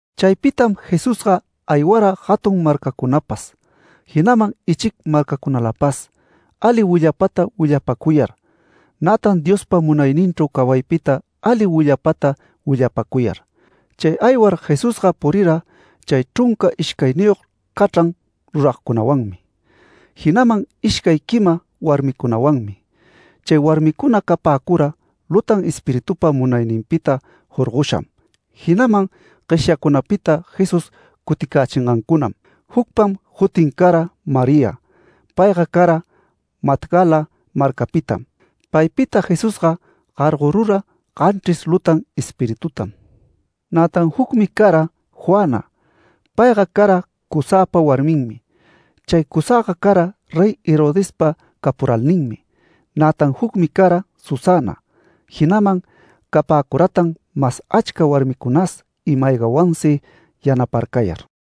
Chaypitam Jesusga aywara jatun marcacunapas, jinaman ichic marcacunalapas ali willapata willapacuyar, nätan Diospa munayninchru cawaypita ali willapata willapäcuyar. Chay aywar Jesusga purira chay chrunca ishcayniyog cachran ruragcunawanmi, jinaman ishcay quima warmicunawanmi. Chay warmicuna capäcura lutan espiritupa munayninpita jorgosham, jinaman gueshyacunapita Jesús cuticächingancunam. Jucpam jutin cara María. Payga cara Magdala marcapitam. Paypita Jesusga gargorura ganchris lutan espiritutam. Nätan jucmi cara Juana. Payga cara Cuzapa warminmi. Chay Cuzaga cara Rey Herodespa capuralninmi, nätan jucmi cara Susana. Jinaman capäcuratan mas achca warmicunas ima-aygawansi yanaparcayar.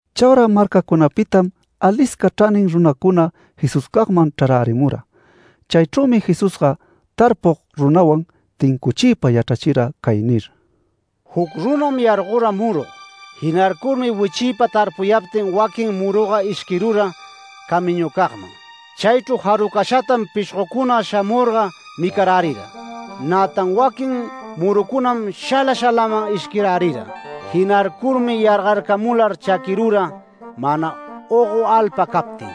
Chaura marcacunapitam alisca chranin runacuna Jesuscagman chrarärimura. Chaychrümi Jesusga tarpug runawan tincuchiypa yachrachira cay nir: “Juc runam yargora murug. Jinarcurmi wichiypa tarpuyaptin waquin muruga ishquirura camiñucagman. Chaychru jarucashatam pishgocuna shamurga micarärira. Nätan waquin murucunam shala shalaman ishquirärira. Jinarcurmi yargarcamular chaquirura mana ogo alpa captin.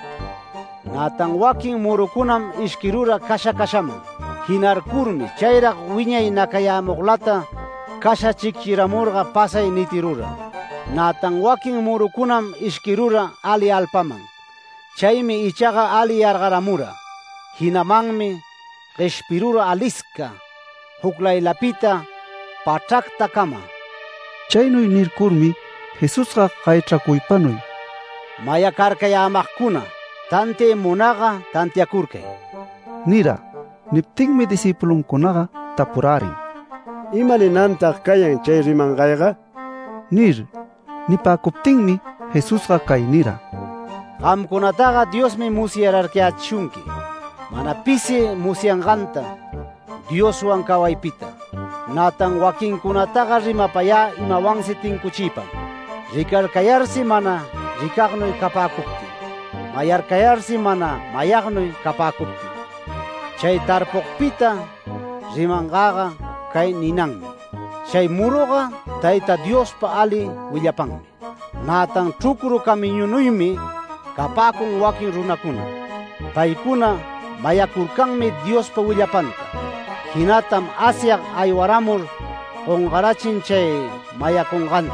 Nätan waquin murucunam ishquirura casha cashaman. Jinarcurmi chayrag wiñay nacayämuglata casha chicchiramurga pasay nitirura. Nätan waquin murucunam ishquirura ali alpaman. Chaymi ichaga ali yargaramura. Jinamanmi gueshpirura alisca, juclaylapita pachractacama”. Chaynuy nircurmi Jesusga gayachracuypanuy: “Mayacarcayämagcuna, tantiay munagga tantiacurcay” nira. Niptinmi discïpuluncunaga tapurärin: “¿Ima ninantag cayan chay rimangayga?” nir. Nipäcuptinmi Jesusga cay nira: “Gamcunataga Diosmi musyarcayächishunqui, mana pisi musyanganta Dioswan cawaypita. Nätan waquincunataga rimapayä imawansi tincuchiypam. ‘Ricarcayarsi mana ricagnuy capäcuptin, mayacayarsi mana mayagnuy capäcuptin’. Chay tarpugpita rimangäga cay ninanmi: Chay muruga Tayta Diospa ali willapanmi. Nätan chrucru camiñunuymi capäcun waquin runacuna. Paycuna mayacurcanmi Diospa willapanta. Jinatam Asyag aywaramur gongarachin chay mayacunganta,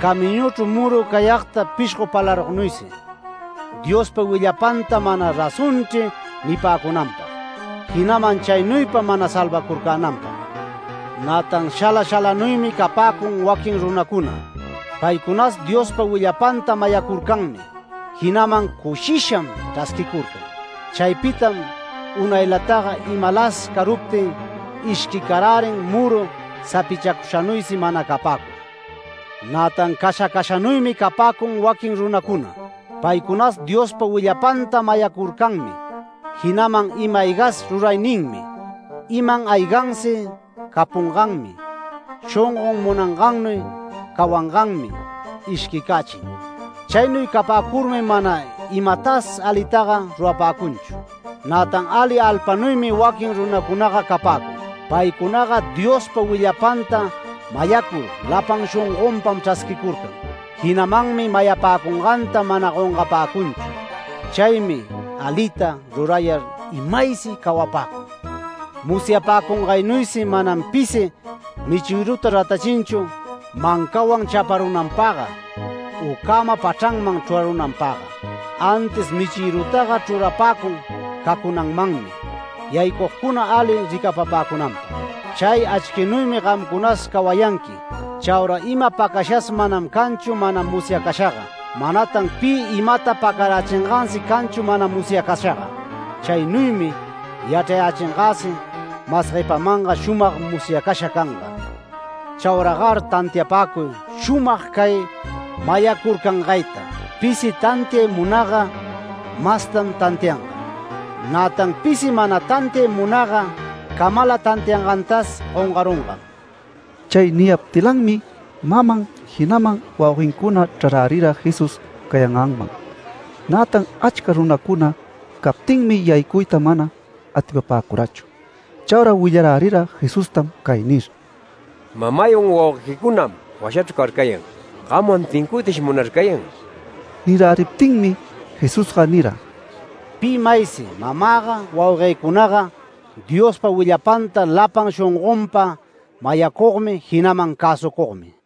camiñuchru muru cayagta pishgo palarugnuysi. Diospa willapanta ‘Mana razonchri’ nipäcunanpag, jinaman chaynuypa mana salvacurcänanpag. Nätan shala shalanuymi capäcun waquin runacuna. Paycunas Diospa willapanta mayacurcanmi, jinaman cushisham chrasquicurcan. Chaypitam unaylataga imalas caruptin ishquicarärin muru sapichacushanuysi mana capäcur. Nätan casha cashanuymi capäcun waquin runacuna. Paycunas Diospa willapanta mayacurcanmi, jinaman ima-aygas rurayninmi, iman aygansi capunganmi, shongon munangannuy cawanganmi, ishquicächin. Chaynuy capäcurmi mana imatas alitaga rurapäcunchu. Nätan ali alpanuymi waquin runacunaga capäcun. Paycunaga Diospa willapanta mayacur lapan shongonpam chrasquicurcan. Jinamanmi mayapäcunganta mana gongapäcunchu. Chaymi alita rurayar imaysi cawapäcun. Musyapäcungaynuysi manam pisi michïruta ratachinchu mancawan chaparunanpagga u cäma pachranman chrurarunanpagga. Antis michïrutaga chrurapäcun cacunanmanmi yaycugcuna ali ricapapäcunanpag. Chay achquinuymi gamcunas cawayanqui. Chaura ima pacashas manam canchu mana musyacashaga, manatan pi imata pacarachingansi canchu mana musyacashaga. Chaynuymi yachrayächingäsi mas guepamanga shumag musyacasha canga. Chauragar tantiapäcuy shumag cay mayacurcangayta. Pisi tantiay munagga mastan tantianga. Nätan pisi mana tantiay munagga camala tantiayangantas gongarungam”. Chay niyaptilanmi maman, jinaman wauguencuna chrarärira Jesús cayanganman. Nätan achca runacuna captinmi, yaycuyta mana atipapäcurachu. Chaura willarärira Jesustam cay nir: “Mamaywan wauguequicunam washachru carcayan. Gamwan tincuytash munarcayan”. Niräriptinmi Jesusga nira: “Pi maysi mamäga, wauguëcunaga, Diospa willapanta lapan shongonpa mayacugmi, jinaman cäsucugmi”.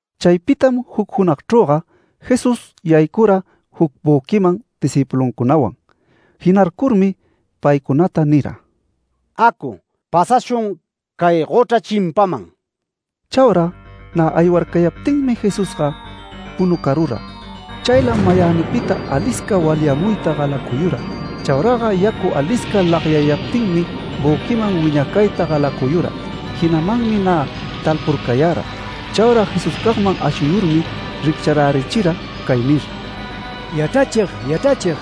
Chaypitam juc junagchrüga Jesús yaycura juc büquiman discïpuluncunawan. Jinarcurmi paycunata nira: “Acu, pasashun cay gochra chimpaman”. Chaura nä aywarcayaptinmi Jesusga punucarura. Chaylam mayänipita alisca walyamuyta galacuyura. Chauraga yacu alisca lagyayaptinmi büquiman wiñacayta galacuyura. Jinamanmi nä talpurcayara. Chaura Jesuscagman ashuyurmi riccharärichira cay nir: “¡Yachrachig, yachrachig!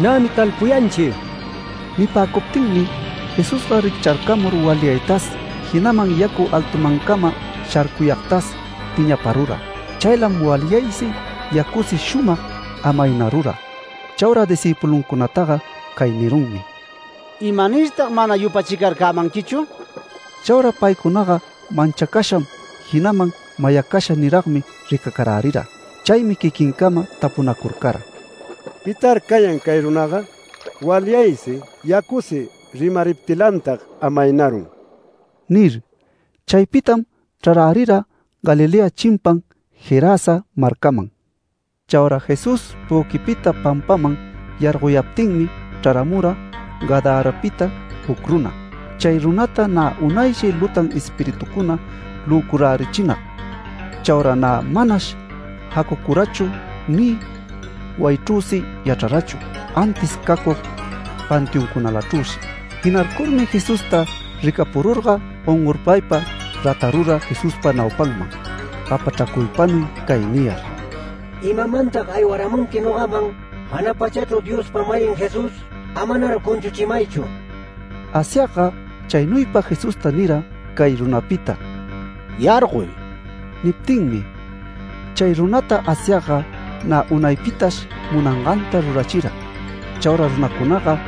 ¡Nämi talpuyanchi!” Nipäcuptinmi Jesusga riccharcamur walyaytas, jinaman yacu altumancama sharcuyagtas piñaparura. Chaylam walyaysi, yacusi shumag amaynarura. Chaura discïpuluncunataga cay nirunmi: “¿Imanirtag mana yupachicarcämanquichu?” Chaura paycunaga manchacasham, jinaman mayacasha niragmi ricacarärira. Chaymi quiquincama tapunacurcara: “¿Pitar cayan cay runaga? Walyaysi, yacusi rimariptilantag amaynarun” nir. Chaypitam chrarärira Galilea chimpan Gerasa marcaman. Chaura Jesús büquipita pampaman yargoyaptinmi chraramura Gadarapita juc runa. Chay runata nä unayshi lutan espiritucuna löcurärichinag. Chaura nä manash jacucurachu, ni wayichrüsi yachrarachu, antis cacug panteoncunalachrüshi. Jinarcurmi Jesusta ricapururga gongorpaypa ratarura Jesuspa naupanman gapachracuypanuy cay niyar: “¿Imamantag aywaramunqui nogaman, jana pachachru Diospa-mayin Jesús? Amanar cunchuchimaychu”. Asyagga chaynuypa Jesusta nira, cay runapita “Yargoy” niptinmi. Chay runata Asyagga nä unaypitash munanganta rurachira. Chaura runacunaga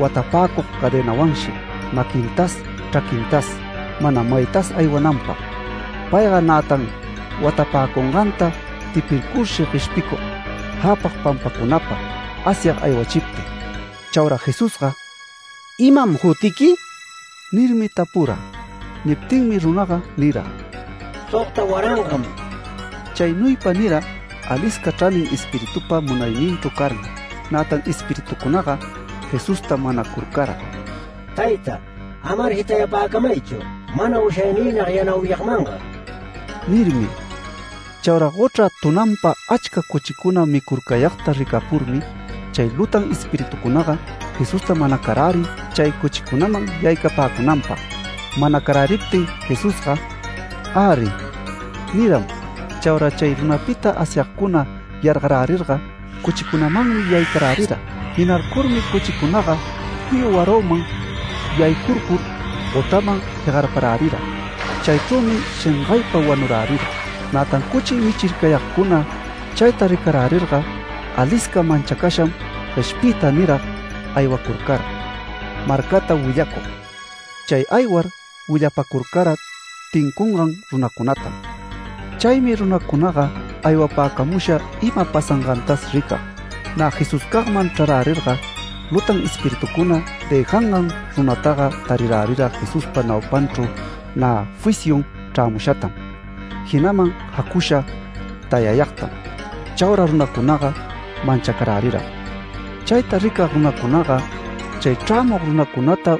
watapäcug cadenawanshi maquintas, chraquintas mana maytas aywananpag. Payga nätan watapäcunganta tipircurshi gueshpicug jäpag pampacunapa Asyag aywachiptin. Chaura Jesusga “¿Imam jutiqui?” nirmi tapura. Niptinmi runaga nira: “Sogta warangam”. Chaynuypa nira alisca chranin espiritupa munayninchru carmi. Nätan espiritucunaga Jesusta manacurcara: “Tayta, amar jitapäcamaychu mana ushayniynag yanauyagmanga” nirmi. Chaura gochra tunanpa achca cuchicuna micurcayagta ricapurmi chay lutan espiritucunaga Jesusta manacarärin chay cuchicunaman yaycapäcunanpag. Manacaräriptin Jesusga “Äri” niram. Chaura chay runapita Asyagcuna yargaräriraga, cuchicunamanmi yaycarärira. Jinarcurmi cuchicunaga juyu waraman yaycurcur, gochraman jegarparärira. Chaychrümi shengaypa wanurärira. Nätan cuchi michircayagcuna chayta ricarärirga, alisca manchacasham gueshpiypa nirag aywacurcara marcata willacug. Chay aywar willapacurcara tincungan runacunatam. Chaymi runacunaga aywapämusha ima pasangantas ricag. Nä Jesuscagman chrarärirga, lutan espiritucuna dëjangan runataga tarirärira Jesuspa naupanchru nä fisyun chrämushatam, jinaman jacusha tayayagtam. Chaura runacunaga manchacaräriram. Chayta ricag runacunaga, chay chrämug runacunata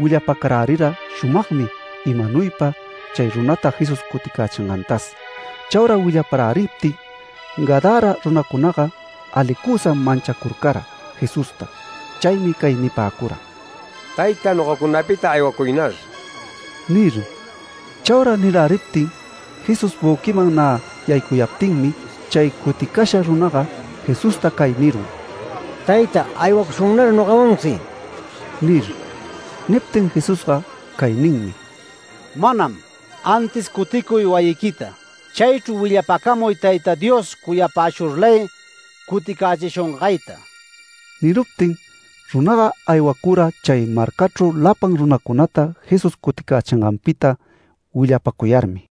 willapacarärira shumagmi, imanuypa chay runata Jesús cuticächingantas. Chaura willaparäriptin, Gadara runacunaga alicusam manchacurcara Jesusta. Chaymi cay nipäcura: “Tayta, nogacunapita aywacuynar” nir. Chaura niräriptin Jesús büquiman nä yaycuyaptinmi, chay cuticasha runaga Jesusta cay nirun: “Tayta, aywacushunnar nogawansi” nir. Niptin Jesusga cay ninmi: “Manam. Antis cuticuy wayiquita. Chaychru willapacamuy Tayta Dios cuyapäshurlay cuticächishungayta”. Niruptin runaga aywacura chay marcachru lapan runacunata Jesús cuticächinganpita willapacuyarmi.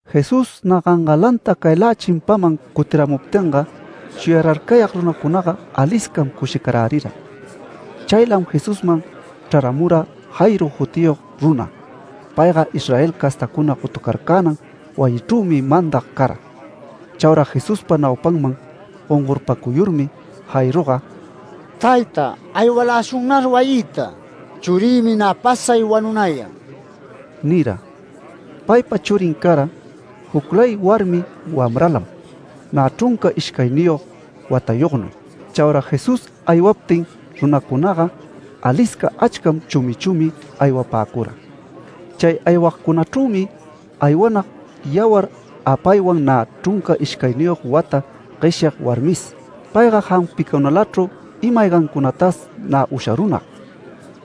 Jesús nä gangalanta caylä chimpaman cutiramuptinga, shuyararcayag runacunaga aliscam cushicarärira. Chaylam Jesusman chraramura Jairo jutiyog runa. Payga Israel castacuna gotucarcänan wayichrümi mandag cara. Chaura Jesuspa naupanman gongorpacuyurmi Jairoga “Tayta, aywaläshunnar wayïta. Churïmi nä pasay wanunayan” nira. Paypa churin cara juclay warmi wamralam, nä chrunca ishcayniyog watayognuy. Chaura Jesús aywaptin runacunaga, alisca achcam, chumi chumi aywapäcura. Chay aywagcunachrümi aywanag yawar apaywan nä chrunca ishcayniyog wata gueshyag warmis. Payga jampicunalachru ima-aygancunatas nä usharunag,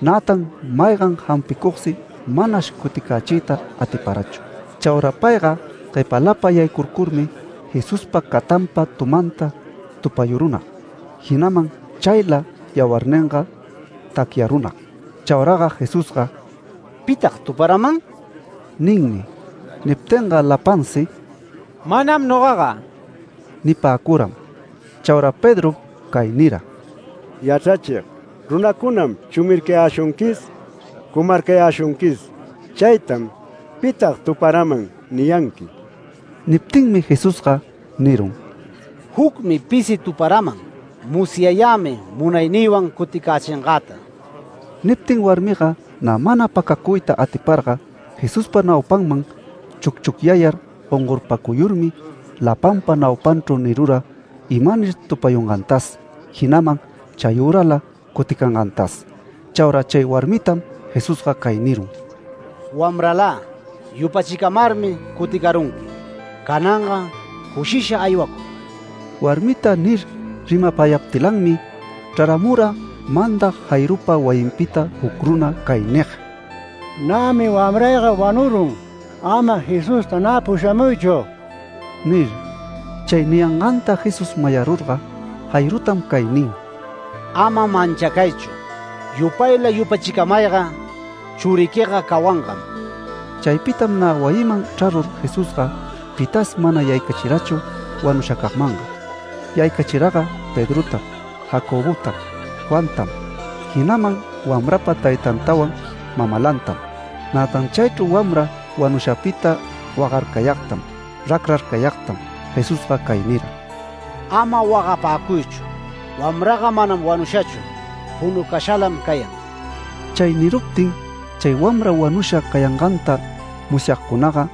nätan maygan jampicugsi manash cuticächiyta atiparachu. Chaura payga guepalapa yaycurcurmi Jesuspa catanpa tumanta tupayurunag. Jinaman chayla yawarninga tacyarunag. Chauraga Jesusga “¿Pitag tuparaman?” ninmi. Niptinga lapansi “Manam nogaga” nipäcuram. Chaura Pedrom cay nira: “Yachrachig, runacunam chumircayäshunquis, cumarcayäshunquis. Chaytam ‘¿Pitag tuparaman?’ niyanqui”. Niptinmi Jesusga nirun: “Jucmi pisi tuparaman. Musyayämi munaynïwan cuticächingäta”. Niptin warmiga nä mana pacacuyta atiparga, Jesuspa naupanman chucchucyayar gongorpacuyurmi, lapanpa naupanchru nirura imanir tupayungantas, jinaman chayürala cuticangantas. Chaura chay warmitam Jesusga cay nirun: “Wamralä, yupachicamarmi cuticarunqui. Cananga cushisha aywacuy”. Warmita nir rimapayaptilanmi, chraramura mandag Jairopa wayinpita juc runa cay nig: “Nämi wamrayga wanurun. Ama Jesusta nä pushamuychu” nir. Chay niyanganta Jesús mayarurga, Jairotam cay nin: “Ama manchacaychu. Yupayla yupachicamayga, churiquiga cawangam”. Chaypitam nä wayiman chrarur Jesusga pitas mana yaycachirachu wanushacagmanga. Yaycachiraga Pedrotam, Jacobotam, Juantam, jinaman wamrapa taytantawan mamalantam. Nätan chaychru wamra wanushapita wagarcayagtam, racrarcayagtam Jesusga cay nira: “Ama wagapäcuychu. Wamraga manam wanushachu. Punucashalam cayan”. Chay niruptin chay wamra wanusha cayanganta musyagcunaga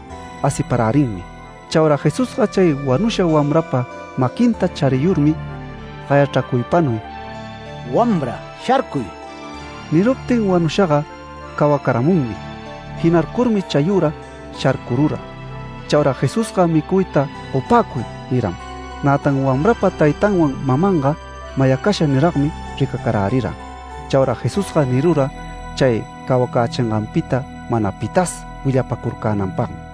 asiparärinmi. Chaura Jesusga chay wanusha wamrapa maquinta chariyurmi gayachracuypanuy: “Wamra, ¡sharcuy!” Niruptin wanushaga cawacaramunmi. Jinarcurmi chayüra sharcurura. Chaura Jesusga micuyta gopäcuy niram. Nätan wamrapa taytanwan mamanga mayacasha niragmi ricacarärira. Chaura Jesusga nirura chay cawacächinganpita mana pitas willapacurcänanpagmi.